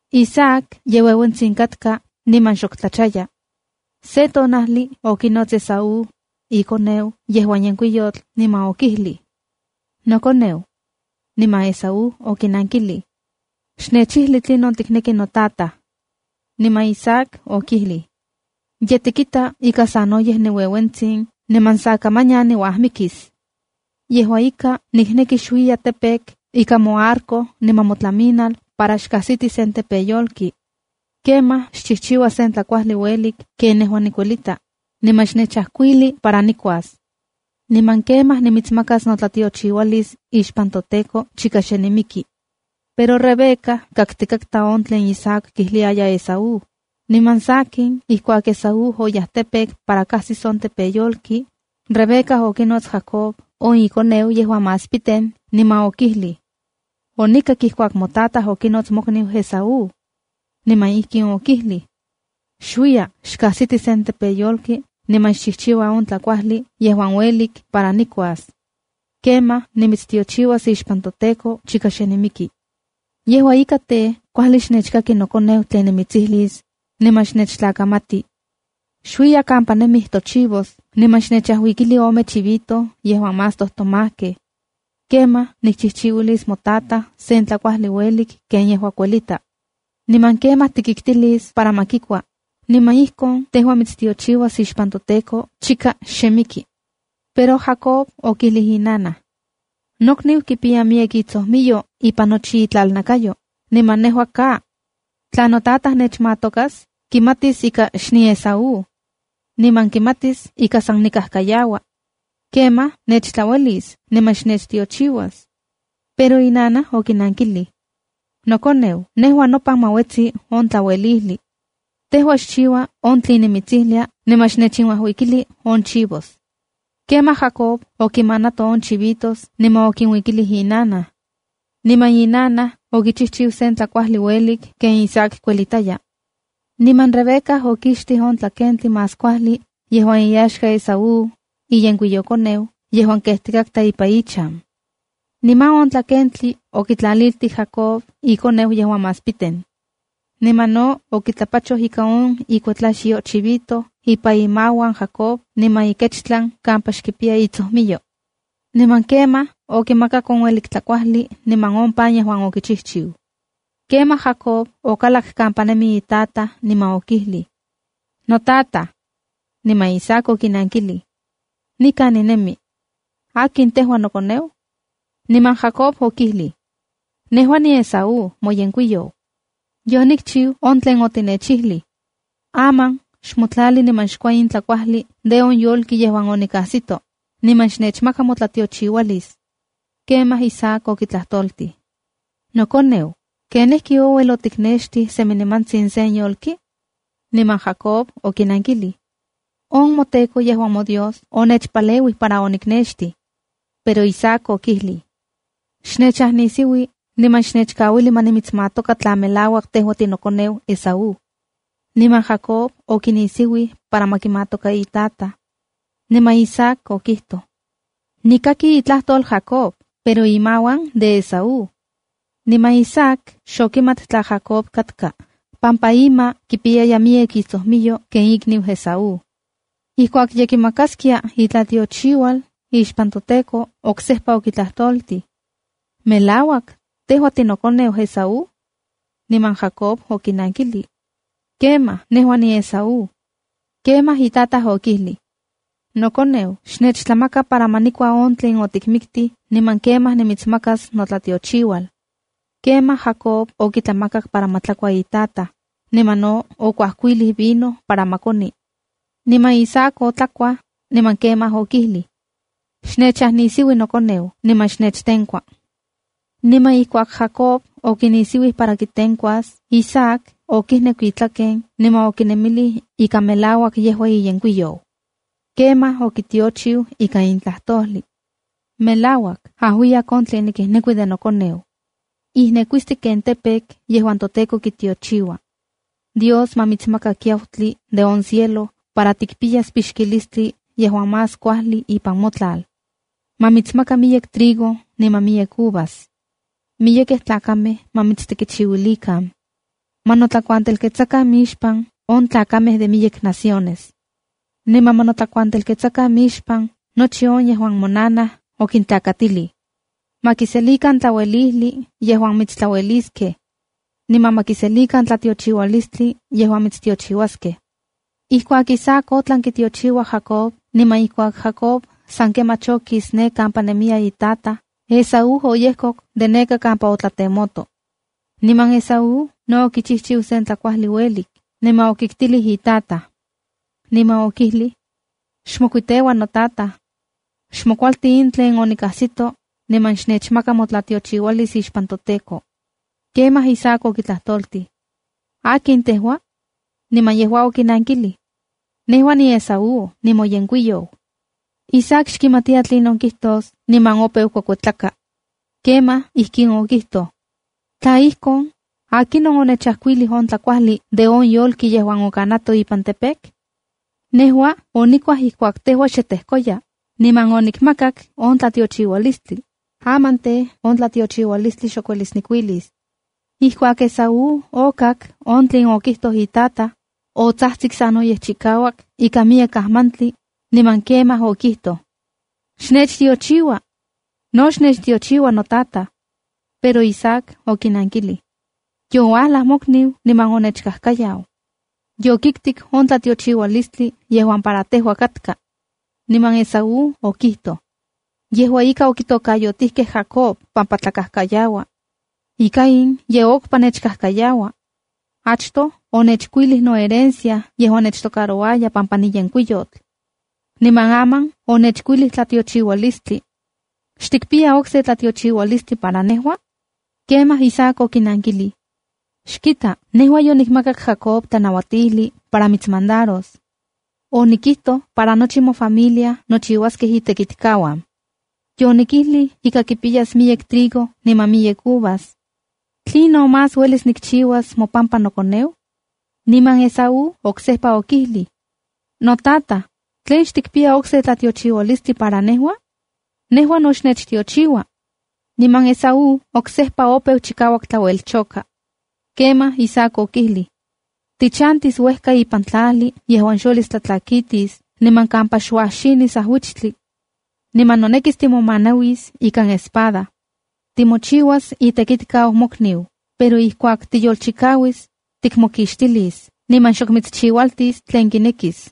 Isaac ye ueuentsin katka niman xok tlachaya. Se tonajli okinots Esaú, ikoneu yejuan yenkuiyotl niman okijlij: —¡Nokoneu! Niman Esaú okinankilij: —Xnechijli tlinon tikneki notataj. Niman Isaac okijlij: —Ye tikita ika sanoyej niueuentsin niman sa kamanyan niuajmikis. Yejua ika, nikneki xuiya campo ikan moarco niman motlaminal para xkajsiti sen tepeyolki. Kemaj xchijchiua sen tlakuajli uelik ken nejua nikuelita, niman xnechajkuili para nikuas. Niman kemaj nimitsmakas notlatiochiualis ixpan toTEKO chika xe nimiki. Pero Rebeca kaktikatka on tlen Isaac kijliaya Esaú. Niman sakin, ijkuak Esaú oyaj campo para kajsis sen tepeyolki, Rebeca okinots Jacob on ikoneu yejuan más piten, niman okijlij: —Onikak ijkuak motataj okinots mokniu Esaú. Niman ijkin okijlij: “Xuiya, xkajsiti sen tepeyolki niman xchijchiua on tlakuajli yejuan uelik para nikuas. Kemaj nimitstiochiuas ixpan toTEKO chika xe nimiki.” Yejua ika tej, kuajli xnechkaki nokoneu tlen nimitsijlis, niman xnechtlakamati: Xuiya kampa nemij tochivos, niman xnechajuikili ome chivito yejuan más tojtomajkej. Kemaj nikchijchiuilis motataj sen tlakuajli uelik ken yejua kuelita. Niman kemaj tikiktilis para ma kikua, niman ijkon tejua mitstiochiuas ixpan toTEKO chika xe miki. Pero Jacob okijlij inanaj: —Nokniu kipiya miyek itsojmiyo ipan nochi itlalnakayo, niman nejua ka. Tla notataj nechmatokas, kimatis ika xniEsaú. niman kimatis ika san nikajkayaua. Kemaj nechtlauelis niman xnechtiochiuas. Pero inanaj okinankilij: —Nokoneu, nejua nopan ma uetsi on tlauelijli. Tejua xchiua yejuan nimitsijlia niman xnechinuajuikili on chivos. Kemaj Jacob okinmanato on chivitos niman okinuikilij inanaj. Niman inanaj okichijchiu sen tlakuajli uelik ken Isaac kuelitaya. Niman Rebeca okixtij on tlakentli más kuajli yejuan iaxka Esaú, iyenkuiyokoneu yejuan kejtikatka ipan ichan. Niman on tlakentli okitlaliltij Jacob ikoneu yejuan más piten. Kemaj no okitlapachoj ika on ikuetlaxyo chivito ipan imauan Jacob niman ikechtlan kampa xkipiya itsojmiyo. Niman kemaj okimakak on uelik tlakuajli niman on pan yejuan okichijchiu. Kemaj Jacob okalak kampa nemi itataj, niman okijlij: —¡Notataj! Niman Isaac okinankilij: —Nikan ninemi. ¿Akin tejua, nokoneu? Niman Jacob okijlij: —Nejua niEsaú, moyenkuiyou. Yonikchiu on tlen otinechijlij. Aman xmotlalij niman xkua in tlakuajli de on yolki yejuan onikajsito, niman xnechmaka motlatiochiualis. Kemaj Isaac okitlajtoltij: —Nokoneu, ¿ken ijki ouel otiknextij semi nimantsin sen yolki? Niman Jacob okinankilij: —On moTEKO, yejuan moDios, onechpaleuij para oniknextij. Pero Isaac okijlij: —Xnechajnisiui niman xnechkauili ma nimitsmatoka tla melak tejua tinokoneu Esaú. Niman Jacob okinisiuij para ma kimatoka itataj. Niman Isaac okijtoj: p —Nikaki itlajtol Jacob, pero imauan de Esaú. Niman Isaac xokimat tla Jacob katka pampa ima kipiyaya miyek itsojmiyo ken ikniu Esaú. Ijkuak ye kimakaskia itlatiochiual ixpan toTEKO, oksejpa okitlajtoltij: —¿Melauak, tejua tinokoneu Esaú? Niman Jacob okinankijlij: —Kemaj, nejua niEsaú. Kemaj itataj okijlij: —Nokoneu, xnechtlamaka para ma nikua on tlen otikmiktij, niman kemaj nimitsmakas notlatiochiual. Kemaj Jacob okitlamakak para ma tlakua itataj, niman no okuajkuilij vino para ma koni. Niman Isaac otlakuaj, niman kemaj okijlij: —Xnechajnisiui nokoneu, niman xnechtenkua. Niman ijkuak Jacob okinisiuij para kitenkuas, Isaac okijneku itlaken niman okinemilij ika melauak yejua iyenkuiyou. Kemaj okitiochiu ika in tlajtojli: “Melauak, ajuiyak on tlen nikijnekui de nokoneu. Ijnekuisti ken campo yejuan toTEKO kitiochiua. Dios ma mitsmaka kiautli de on cielo, para tikpiyas pixkilistli yejuan más kuajli ipan motlal. Ma mitsmaka miyek trigo, niman miyek uvas. Miyekej tlakamej ma mitstekichiuilikan. Ma notlakuantelketsakan mixpan on tlakamej de miyek naciones. ¡Niman ma notlakuantelketsakan mixpan nochi on yejuan monanaj okintlakatilij! Xkinmandaro mokniuan. Ma kiselikan tlauejlijli, yejuan mitstlaueliskej. Niman ma kiselikan tlatiochiualistli yejuan mitstiochiuaskej.” Ijkuak Isaac otlan kitiochiua Jacob, niman ijkuak Jacob san kemach okis ne kampa nemiya itataj, Esaú oyejkok de neka kampa otlatemoto. Niman Esaú no okichijchiu sen tlakuajli uelik, niman okiktilij itataj. Niman okijlij: —Xmoketsteua notataj. Xmokualti in tlen onikajsito, niman xnechmaka motlatiochiualis ixpan toTEKO. Kemaj Isaac okitlajtoltij: —¿Akin tejua? Niman yejua okinankilij —Nejua niEsaú, nimoyenkuiyou. Isaac xkimatiya tlinon kijtos niman opeu kuekuetlaka. Kemaj ijkin okijtoj: —Tla ijkon, ¿akinon onechajkuilij on tlakuajli de on yolki yejuan okanato ipan campo? Nejua onikuaj ijkuak tejua xe tejkoya, niman onikmakak on tlatiochiualistli. Aman tej, on tlatiochiualistli xok uelis nikuilis. Ijkuak Esaú okak on tlen itataj okijtoj, otsajtsik sanoyej chikauak ika miyek ajmantli, niman kemaj okijtoj: —¡Xnechtiochiua! ¡No xnechtiochiua notataj! Pero Isaac okinankilij: —Youalaj mokniu niman onechkajkayau. Yokiktik on tlatiochiualistli yejuan para tejua katka. Niman Esaú okijtoj: —¡Yejua ika, okitokayotijkej Jacoba pampa tlakajkayaua! ¡Ika in ye okpa nechkajkayaua! Achtoj onechkuilij noherencia yejuan nechtocarouaya pampa niyenkuiyotl. Niman aman onechkuilij notlatiochiualis. ¿Xtikpiya okse tlatiochiualistli para nejua? Kemaj Isaac okinankilij: —Xkita, nejua yonikmakak Jacob tlanauatijli para mitsmandaros. Onikijtoj para nochi mofamilia nochiuaskej itekitlkauan. Yonikijlij ika kipiyas miyek trigo niman miyek uvas. ¿Tlinon más uelis nikchiuas mopampa nokoneu? Niman Esaú oksejpa okijlij: —Notataj, ¿tlen xtikpia okse tlatiochiualistli para nejua? ¡Nejua no xnechtiochiua!. Niman Esaú oksejpa opeu chikauak tlauelchoka. Kemaj Isaac okijlij: “Tichantis uejka ipan tlajli yejuan xuelis tlatlakitis, niman kampa xuajxinis ajuichtli. Niman nonekis timomanauis ikan espada. Timochiuas itekitkau mokniu, pero ijkuak tiyolchikauis, tikmokixtilis niman xok mitschiualtis tlen kinekis.”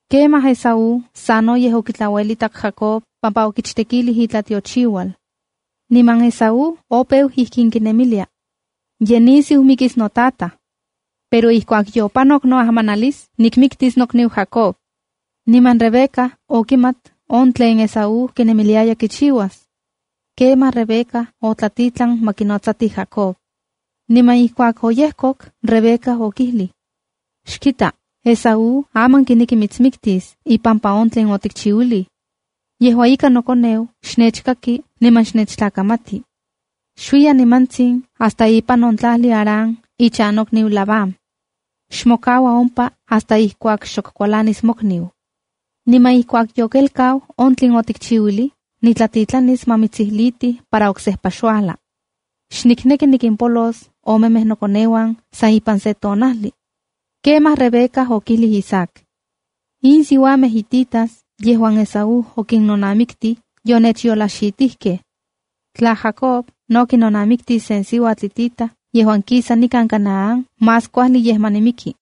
Kemaj Esaú sanoyej okitlauelitak Jacob pampa okichtekilij itlatiochiual. Niman Esaú opeu ijkin kinemilia: “Ye nisiu mikis notataj. Pero ijkuak yopanok noajmanalis, nimiktis nokniu Jacob.” Niman Rebeca okimat on tlen Esaú kinemiliaya kichiuas. Kemaj Rebeca otlatitlan ma kinotsatij Jacob. Niman ijkuak oyejkok, Rebeca okijlij: —Xkita, Esaú aman kineki mitsmiktis ipampa on tlen otikchiuilij. Yejua ika, nokoneu, xnechkaki niman xnechtlakamati. Xuiya nimantsin hasta ipan on tlajli Harán ichan nokniu Labán. Xmokaua ompa hasta ijkuak xok kualanis mokniu. Niman ijkuak yokelkau on tlen otikchiuilij, nitlatitlanis ma mitsijlitij para oksejpa xuajla. ¡Xnikneki nikimpolos omemej nokoneuan san ipan se tonajli! Kemaj Rebeca okijlij Isaac: —In siuamej hititas yejuan Esaú okinnonamiktij, yonechyolajxitijkej. Tla Jacob no kinonamiktis sen siuatl hitita yejuan kisa nikan Canaán, más kuajli yej ma nimiki.